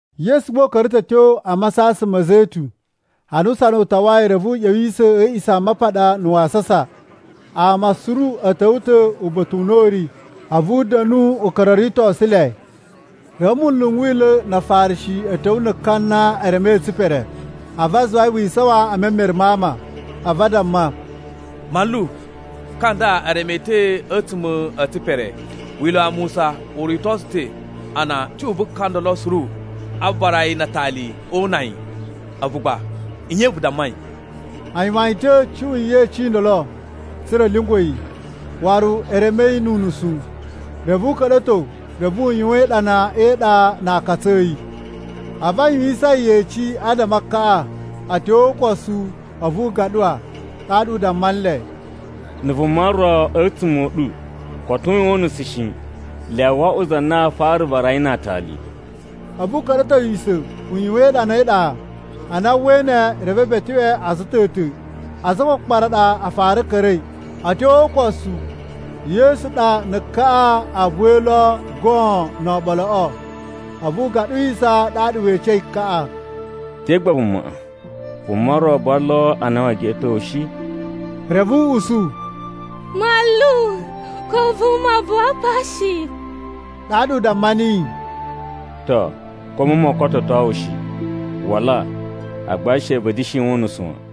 Yesu gba u ka̱ra̱ ta̱ a̱ tyo a Masasan ma̱ Zetun. Ana usana u tawai, reve u ꞌya̱wisa̱ a̱ A̱a̱ꞌisamapaɗa na̱ wasasa. Ama suru a̱ ta̱wa̱ ta̱ uba̱ta̱ u na u ri, a̱vu u da̱nu u ka̱ra̱ o ritosu le. Reve munlu n Wila̱ na Afarishi a̱ ta̱wa̱ na̱ ka na e remei e tsipere. A̱vu a zuwa yi wi isawan e memere ma ama. A̱vu a damma, “Manlu, ka nda e reme yi ta̱ a̱tsuma̱ e tsipere. Wila̱ wa Musa u rito tsu ta̱ a na cuꞌun vu ka ndolo suru a vara yi na atali o una yi! A̱vu gba nye vu dammai?” A yuwan yi ta̱ cuꞌun yeci i ndolo tsa̱ra̱ a̱ lyungwa̱ yi, waru e reme yi nu unusu. Reve u ka̱ɗa̱to reve u yuwan iɗana e iɗa na aakatsu a̱ yi. A̱vu a yuwisan yi yeci adama a kaꞌa, a̱ tyo o ukosu a̱vu u gaɗuwa ɗaɗa u damma nle, “Na̱ vuma ro a̱tsuma̱ a̱ ɗu koto u yuwan unusu shi, lyawa wo oꞌwo za na aa fara vara yi na aatali.” A̱vu u ka̱ɗa̱towisa̱ u yuwan iɗana e iɗa. Ana a uwwai ne, reve e beteꞌwe a̱za̱ a̱ ta̱ ta̱. Aza a kpakpara ɗa a fara ka̱ra̱i. A̱ tyo o ukosu Yesu ɗa na̱ kaꞌa a buwai lo goon no oɓoloꞌo. A̱vu u gaɗuwisa ɗaɗa we ecei kaꞌa, “Te gba amaꞌa? Vuma ro buwa lo a na wee geꞌeto wu shi?” Reve u usu, “Manlu, ko vuma buwa pa shi.” Ɗaɗa u damma niyi, “To, ko a̱mu moo kototo wu shi. Wala, agba she vu da̱shi yuwan unusu wan.”]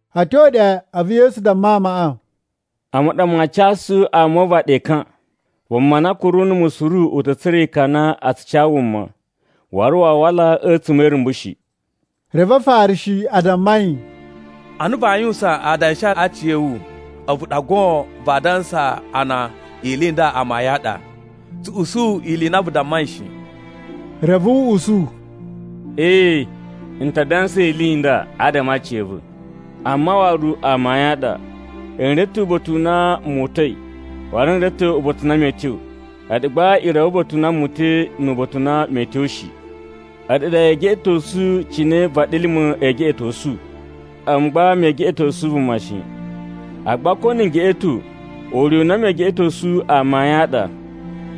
A̱ tyo ɗe, a̱vu Yesu damma amaꞌa, “A̱mu ɗa maa casu ama o uvaɗi ekan. Vuma na kuru numu suru u ta̱ tsura̱ ekan a na a tsu ca wuma, waru waa wala a̱tsuma̱ e irumbu shi.” Reve Afarishi a damma yi, “Ana vaa yuwusan adanshi a aciya̱wu, a̱vu ɗa goon vaa dansa a na ili i nda amayun a ɗa. Tsu usu ili i na vu dammai shi.” Reve u usu, “Ee, n ta dansa ili i nda adama a aciya̱va̱, amma waru amayun a ɗa. N reve ta̱ uba̱ta̱ u na mu uta̱i, waru n reve ta̱ uba̱ta̱ u na mee tyo. A̱ɗu gba i reve uba̱ta̱ u na mu uta̱i nu uba̱ta̱ u na mee tyo shi. A̱ɗu ɗa yee geꞌetosu cine vaɗilima̱ ee geꞌetosu. A̱mu gba mee geꞌetosu vuma shi. Agba ko na̱ n geꞌeto, ure u na mee geꞌetosu amayun a ɗa,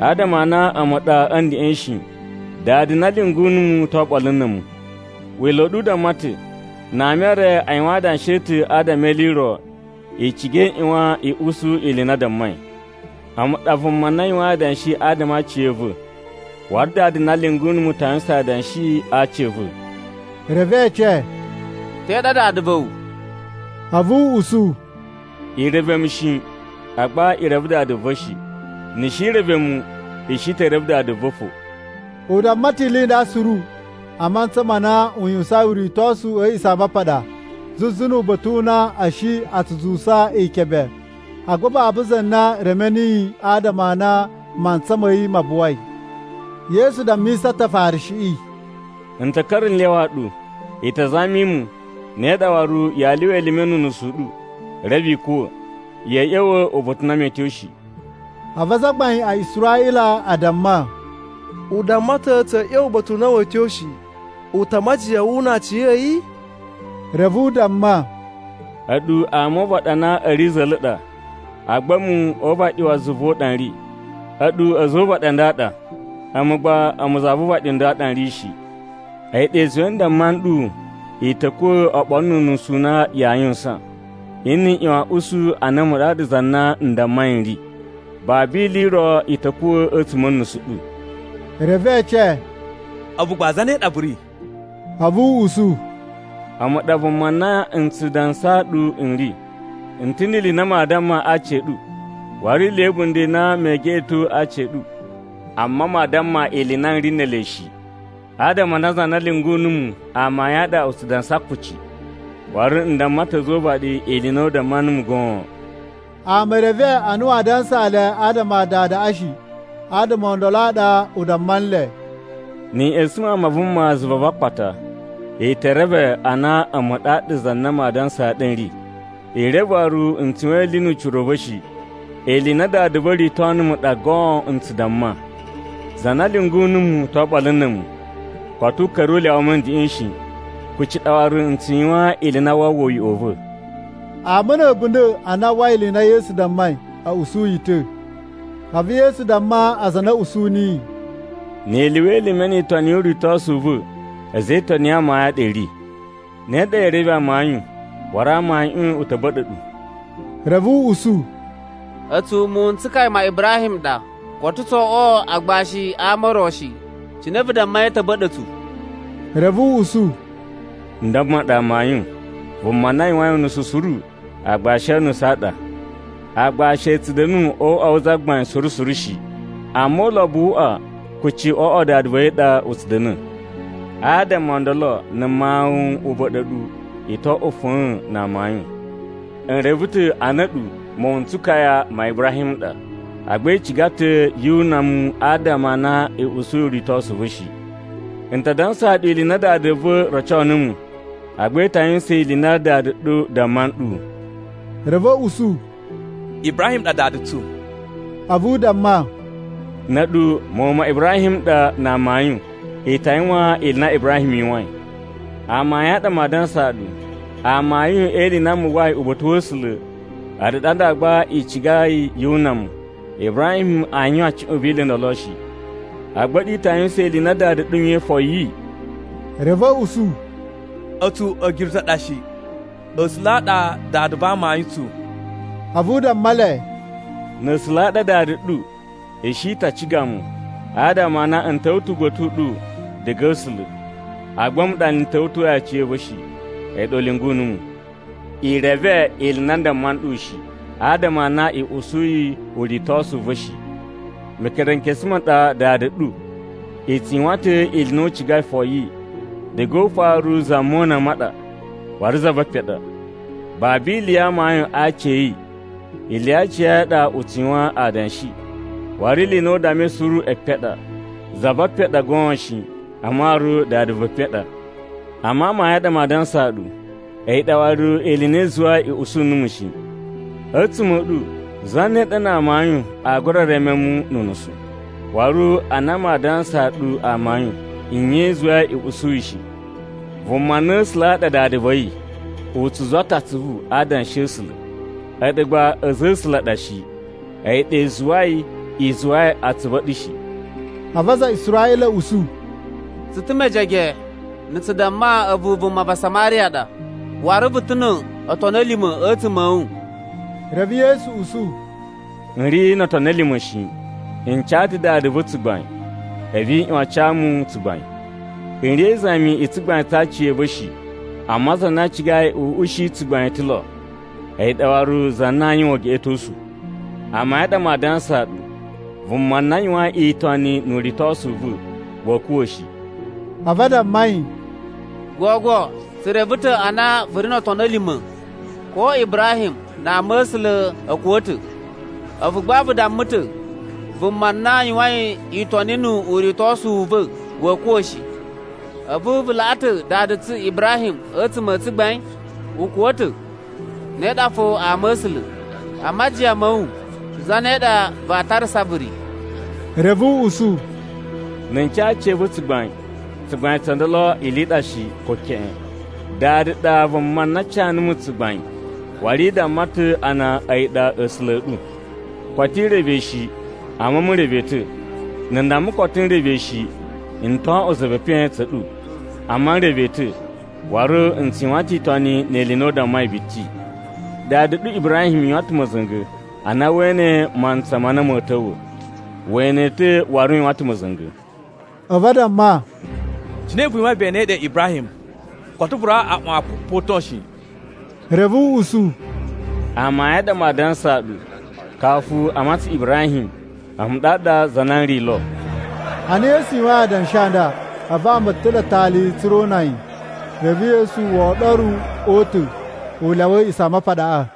adama a na a̱mu ɗa a̱ ndeꞌen shi. Dada na lyungu numu to oɓolo na̱ a̱mu. Wila̱ u ɗu u damma ta̱, na ama e re a yuwan adanshi a̱ ta̱ adama e ili i ro, i ciga i ꞌyuwan i usu ili i na a dammai. A̱mu ɗa vuma na yuwain adanshi adama a aciya̱va̱, waru Dada na lyungu numu ta yuwusan adanshi a aci a̱ va̱.” Reve e ece, “Te ɗa dada va̱ wu?” A̱vu u usu, “I reve mu shi, agba i reve Dada va̱ shi. Ni i shi i reve mu, i shi te reve Dada va̱ fo.” U damma ta̱ ili i nda suru a mantsa ma na u yuwusain uritosu a̱ A̱a̱ꞌisamapaɗa, zuzu nu uba̱ta̱ u na a̱ shi a zuwusa ikebe. Agba babu za na reme niyi, adama a na mantsa ma̱ yi ma buwai. Yesu dammisa ta̱ Afarishiꞌi, “N ta̱ ka̱ra̱ n lyawa ɗu, i ta zami mu, ne ɗa waru yaa lyuwa elime nu unusu u ɗu, reve i kuwa̱. Ya̱a̱ ꞌya̱wa̱ uba̱ta̱ u na mee tyo shi.” A̱vu azagbain a Israꞌila a damma, “U damma ta̱ tsa̱a̱ ꞌya̱wa̱ uba̱ta̱ u na wee tyo shi. U ta a majiyan wu una aciya̱yi?” Reve u damma, “A̱ɗu ama o uvaɗi a na a̱ ri za̱la̱ ɗa, agba a̱mu o uvaɗi wa zuva u ɗa n ri. A̱ɗu a̱za̱ o uvaɗi a nda a ɗa, agba a̱mu za vu uvaɗi u nda u ɗa n ri shi. A̱yi ɗa i zuwai n damma nɗu i ta̱ kuwa̱ oɓolo nu unusu u na yaa yuwusan. Nni i ꞌyuwan a̱ usu a na a̱mu ɗaɗa za na n dammai n ri, babu ili i ro i ta̱ kuwa̱ a̱tsuma̱ a̱ nusu ɗu.” Reve e ece, “A̱vu gba zane ɗa vu ri?” A̱vu u usu, “A̱mu ɗa vuma na n tsu dansaa ɗu n ri. N ta̱ ni ili i na maa damma aci a̱ ɗu, waru ni ili ya̱ a̱bunda̱ i na mee geꞌeto a aci a̱ ɗu. Amma maa damma ili i na n ri ne ele shi. Adama a na za na lyungu numu amayun a ɗa u tsu dansa kuci, waru n damma ta̱ a̱za̱ o uvaɗi ili i na u damma numu goon.” Ama e reve a na waa dansaa le adama a Dadaꞌa shi. Adama o ndolo a ɗa u damma nle, “Ni i ꞌya̱sa̱n Mawun ma Vuma zuva va akpata, i ta̱ reve a na a̱mu ɗaɗa za na maa dansaa ɗu n ri. I reve waru n tsu yuwan ili nu ucira u va̱ shi. Ili i na Dada va̱ rito numu ɗa goon n tsu damma. Za na lyungu numu to oɓolo na̱ a̱mu. Koto u ka̱ra̱ u lyawa mu a̱ ndeꞌen shi, kuci ɗa waru n tsu yuwan ili i na waa uwwa uyoꞌo u va̱.” Ama a̱ a̱bunda̱ a na a uwwai ili i na Yesu dammai, a̱ usu yi ta̱. A̱vu Yesu damma aza a na a̱ usu niyi, “Ni i lyuwa elime ni itoni yu uritosu u va̱ a̱za̱ e itoni ya amayun a ɗa i ri. Ne ɗa yee reve amayun, waru amayuꞌun u ta̱ ba̱ɗa̱ ɗu.” Reve a̱ usu, “A̱tsu muwun n tsukaya ma Ibrahim n ɗa, koto tso oꞌwo agbashi a ama o ro shi. Cine vu dammai a̱ ta̱ ba̱ɗa̱ tsu?” Reve u usu, “N damma ɗu amayun, vuma na yuwain unusu suru aagbashi o unusu a ɗa. Aagbashi a̱ tsu da̱nu o uꞌwa wu zagbain suru suru shi, amma ulobo wu uꞌwa kuci o uꞌwa wa dada va̱ yi ɗa u tsu da̱na̱. Adama o ndolo na̱ Mawun u ba̱ɗa̱ ɗu, i to oꞌwo fa̱a̱n na amayun. N reve ta̱ a na a̱ɗu muwun n tsukaya ma Ibrahim n ɗa, agba i ciga ta̱ yu una mu adama a na i usuyi uritosu u va̱ shi. N ta dansaa ɗu ili i na Dada va̱ roco numu, agba i ta yuwusan ili i na dada ɗu damma nɗu.” Reve a̱ usu, “Ibrahim ɗa dada tsu.” A̱vu u damma, “Na̱ a̱ɗu muwun ma Ibrahim n ɗa na amayun, i ta yuwan ili i na Ibrahim yuwain. Amayun a ɗa maa dansaa ɗu, amayun e ili i na mu uwwai uba̱ta̱ wa̱ A̱sula̱, a̱ɗu ɗa nda gba i cigai yu una mu. Ibrahim aa yuwan cuꞌun vi ili i ndolo shi. Agba a̱ɗu i ta yuwusan ili i na dada ɗu yuwain foyi.” Reve a̱ usu, “A̱tsu a̱girutu a ɗa shi! A̱sula̱ a ɗa Dada va amayun tsu.” A̱vu u damma le, “Na̱ A̱sula̱ a ɗa Dada ɗu, i shi ta ciga mu, adama a na n ta̱wa̱ ta̱ uba̱ta̱ u ɗu diga a̱ A̱sula̱. Agba a̱mu ɗa n ta̱wa̱toyi aciya̱va̱ shi, a̱yi ɗa u lyungu numu. I reve ili i na n damma nɗu shi, adama a na i usuyi uritosu u va̱ shi. Mekerenkesu ma ɗa dada ɗu, i tsu yuwan ta̱ ili i na u cigai foyi. Diga o ufaru za mona ɗa waru za ve epen ɗa. Babu ili ya amayun a aci a̱ yi. Ili ya aciya̱yi a ɗa u tsu yuwan adanshi, waru ili i na u dammai suru epen a ɗa. Za ve epen ɗa goon shi, amma waru dada ve epen ɗa. Amma amayun a ɗa maa dansaa ɗu, a̱yi ɗa waru ili i na i zuwai i usu numu shi. A̱tsuma̱ a̱ ɗu, zane ɗa na amayun aa gura reme mu nu unusu? Waru ana maa dansaa ɗu amayun, nye i zuwai i usuyi shi? Vuma na A̱sula̱ a ɗa Dada va̱ yi, u tsu zuwa ta̱ atsuvu a Adanshi a̱ A̱sula̱. A̱ɗu gba a̱za̱ a̱ A̱sula̱ a ɗa shi, a̱yi ɗa i zuwai i zuwai atsuvu a̱ ɗu shi.” A̱vu aza a Israꞌila a̱ usu, “Tsu ta̱ mejege na̱ tsu damma a̱vu vuma va Samariya ɗa, waru vu ta̱ no otoni a̱ lima̱ a̱tsuma̱ a̱ wu!” Reve Yesu usu, “N ri no otoni a lima̱ shi. N ca ta Dada va̱ tsugbain, a̱vu i ꞌyuwan a ca mu tsugbain. N ri e izami i tsugbain tsa aciya̱va̱ shi. Amma za na cigai n ushi tsugbain ta̱ lo, a̱yi ɗa waru za na aa yuwan ugeꞌetosu. Amayun a ɗa maa dansaa ɗu, vuma na yuwain itoni nu uritosu u va̱, wa̱a̱ kuwa̱ shi.” A̱vu a damma yi, “Gogo tsu reve ta̱ a na vu ri no otoni a̱ lima̱! Ko Ibrahim na ama̱sula̱ a̱ kuwa̱ ta̱. A̱vu gba vu damma ta̱, ‘Vuma na yuwain itoni nu uritosu u va̱, wa̱a̱ kuwa̱ shi.’ A̱vu vu laꞌa ta̱ dada tsu Ibrahim a̱tsuma̱ a tsugbain? U kuwa̱ ta̱, ne ɗa fo ama̱sula̱. A majiyan ma̱ wu, zane ɗa vaa tarasa vu ri?” Reve u usu, “Na̱ n ca aciya̱va̱ tsugbain, tsugbain tso ndolo ili i ɗa shi, ko keꞌen. Dada ɗa vuma na ca numu tsugbain, waru i damma ta̱ a na a̱yi ɗa A̱sula̱ a̱ ɗu. Koto i reve yi shi, amma a̱mu n reve yi ta̱. Na̱ n damma koto n reve yi shi, n to oꞌwo za ve epen tsa̱ a̱ɗu. Amma n reve yi ta̱, waru n tsu yuwan ta̱ itoni ni ili i na u dammai biti. Dada ɗu Ibrahim yuwan ta̱ ma̱za̱nga̱ a na wee ene mantsa ma na ma̱a̱ ta̱wa̱. We ene yi ta̱ waru u yuwan ta̱ ma̱za̱nga̱.” A̱vu a damma, “Cine vu yuwain ve enei ɗe Ibrahim? Koto vu rawa aꞌwan kupoton shi.” Reve u usu, “Amayun a ɗa maa dansaa ɗu, kafu a matsan Ibrahim, A̱mu ɗaɗa za na n ri lo.” Ana Yesu yuwain adanshi a nda, a̱vu ama a̱ ta̱ɗa̱ atali tsa̱ra̱ o una yi. Reve Yesu wo oɗoru o uta̱, u lyawa A̱a̱ꞌisamapaɗaꞌa.